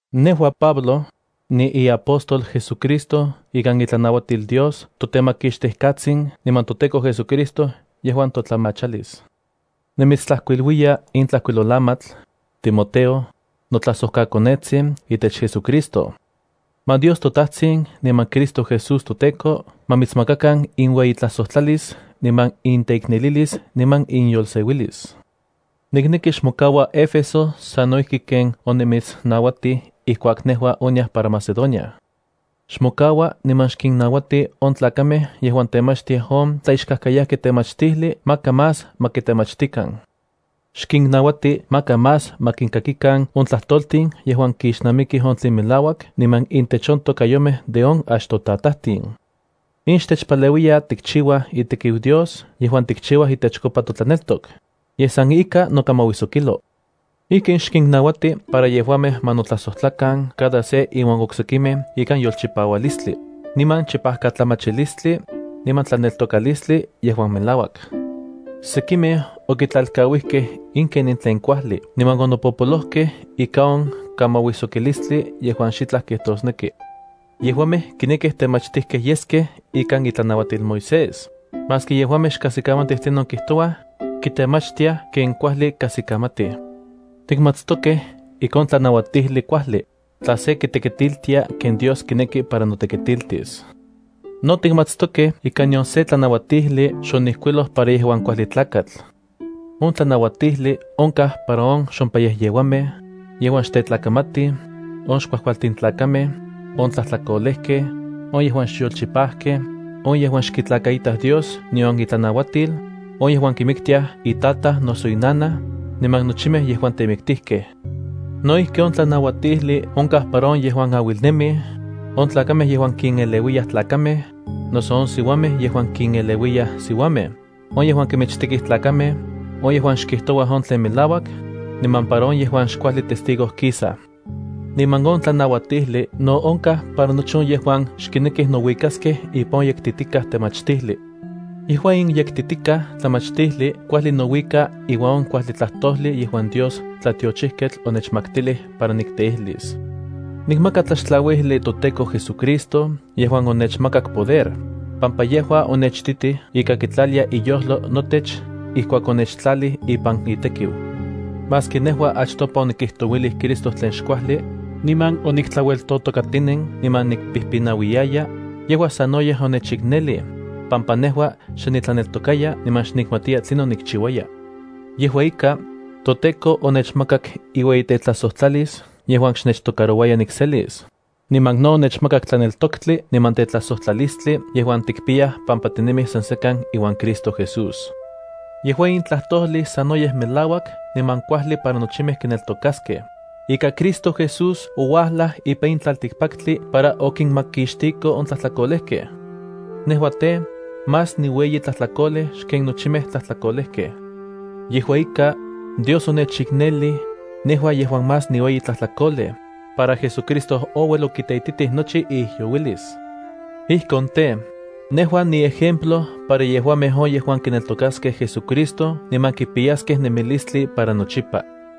Nejua, Pablo, niiapóstol JesuCristo ikan itlanauatil Dios toTemakixtijkatsin niman toTEKO JesuCristo yejuan totlamachalis. Nimitstlajkuiluiya in tlajkuilolamatl, Timoteo, notlajsojkakonetsin itech JesuCristo. Ma Dios toTajtsin niman Cristo Jesús toTEKO ma mitsmakakan inueyitlajsojtlalis niman inteiknelilis niman inyolseuilis. Nikneki xmokaua Éfeso sano ijki ken onimitsnauatij ijkuak nejua oniaj para Macedonia. Xmokaua niman xkinnauati on tlakamej yejuan temachtiaj on tlaixkajkayajki temachtijli maka más ma kitemachtikan. Xkinnauati maka más ma kinkakikan on tlajtoltin yejuan kixnamikij on tlen melauak niman intech on tokayomej de on achtotatajtin. In xtechpaleuiya tikchiuaj itekiu Dios yejuan tikchiuaj itechkopa totlaneltok, yej san ika nokamauijsokilo. Ijkin xkinnauati para yejuamej ma notlajsojtlakan cada se iuan oksekimej ikan yolchipaualistli, niman chipajkatlamachilistli, niman tlaneltokalistli yejuan melauak. Sekimej okitlalkauijkej in kenin tlen kuajli niman onopopolojkej ika on kamauijsokilistli yejuan xitlaj kijtosneki. Yejuamej kinekij temachtijkej yeskej ikan itlanauatil Moisés, maski yejuamej xkajsikamatij tlinon kijtouaj, kitemachtiaj ken kuajli kajsikamatij. Tikmatstokej ika on tlanauatijli kuajli, tla se kitekitiltia ken Dios kineki para notekitiltis. No tikmatstokej ika nion se tlanauatijli xonijkuiloj para yejuan kuajli tlakatl. On tlanauatijli onkaj para on xompayejyeuamej, yejuan xtetlakamatij, on xkuajkualtin tlakamej, on tlajtlakolejkej, on yejuan xyolchipajkej, on yejuan xkitlakaitaj Dios nion itlanauatil, on yejuan kimiktiaj itataj noso inanaj, niman nochimej yejuan temiktijkej. No ijki on tlanauatijli onkaj para on yejuan auilnemij, on tlakamej yejuan kineleuiyaj tlakamej, noso on siuamej yejuan kineleuiyaj siuamej, on yejuan kimichtekij tlakamej, on yejuan xkijtouaj on tlen melauak, niman para on yejuan xkuajli testigo kisaj. Niman on tlanauatijli no onkaj para nochi on yejuan xkinekij nouikaskej ipan on yektitikaj temachtijli. Yejua in yektitikaj temachtijli kuajli nouika iuan on kuajli tlajtojli yejuan Dios tlatiochijketl onechmaktilij para nikteijlis. Nikmaka tlaxtlauijli toTEKO JesuCristo yejuan onechmakak poder, pampa yejua onechititij ika kitlalia iyojlo notech ijkuak onechtlalij ipan itekiu. Maski nejua achtopa onikijtouilij Cristo tlen xkuajli, niman oniktlaueltotokatinen niman nikpijpinauiyaya, yejua sanoyej onechiknelij, pampa nejua xe nitlaneltokaya niman xnikmaktiya tlinon nikchiuaya. Yejua ika, toTEKO onechmakak iueyitetlajsojtlalis yejuan xnechtocarouaya nikselis, niman no onechmakak tlaneltoktli niman tetlajsojtlalistli yejuan tikpiyaj pampa tinemij san sekan iuan Cristo Jesús. Yejua in tlajtojli sanoyej melauak niman kuajli para nochimej kineltokaskej, ika Cristo Jesús ouajlaj ipan in tlaltikpaktli para okinmakixtiko on tlajtlakolejkej. Nejua tej, más niueyi tlajtlakolej xken nochimej tlajtlakolejkej. Yejua ika, Dios onechiknelij, nejua yejuan más niueyi tlajtlakolej, para JesuCristo ouel okiteititij nochi iijyouilis. Ijkon tej, nejua niejemplo para yejuamej on yejuan kineltokaskej JesuCristo niman kipiyaskej nemilistli para nochipa.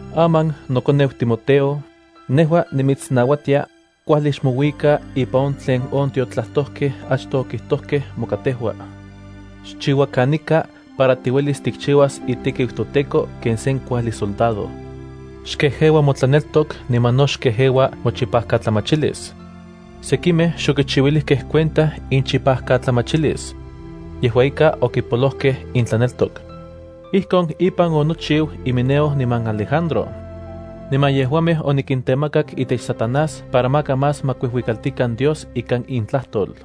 Aman nokoneu Timoteo, nejua nimitsnauatia: Kuajli xmouika ipan on tlen on tiotlajtojkej achtoj okijtojkej moka tejua. Xchiua kanika para tiuelis tikchiuas itekiu toTEKO ken sen kuajli soldado. Xkejeua motlaneltok niman no xkejeua mochipajkatlamachilis. Sekimej xokichiuilijkej cuenta inchipajkatlamachilis. Yejua ika okipolojkej intlaneltok. Ijkon ipan onochiu Himeneo niman Alejandro. Niman yejuamej onikintemakak itech Satanás para maka más ma kuijuikaltikan Dios ikan intlajtol.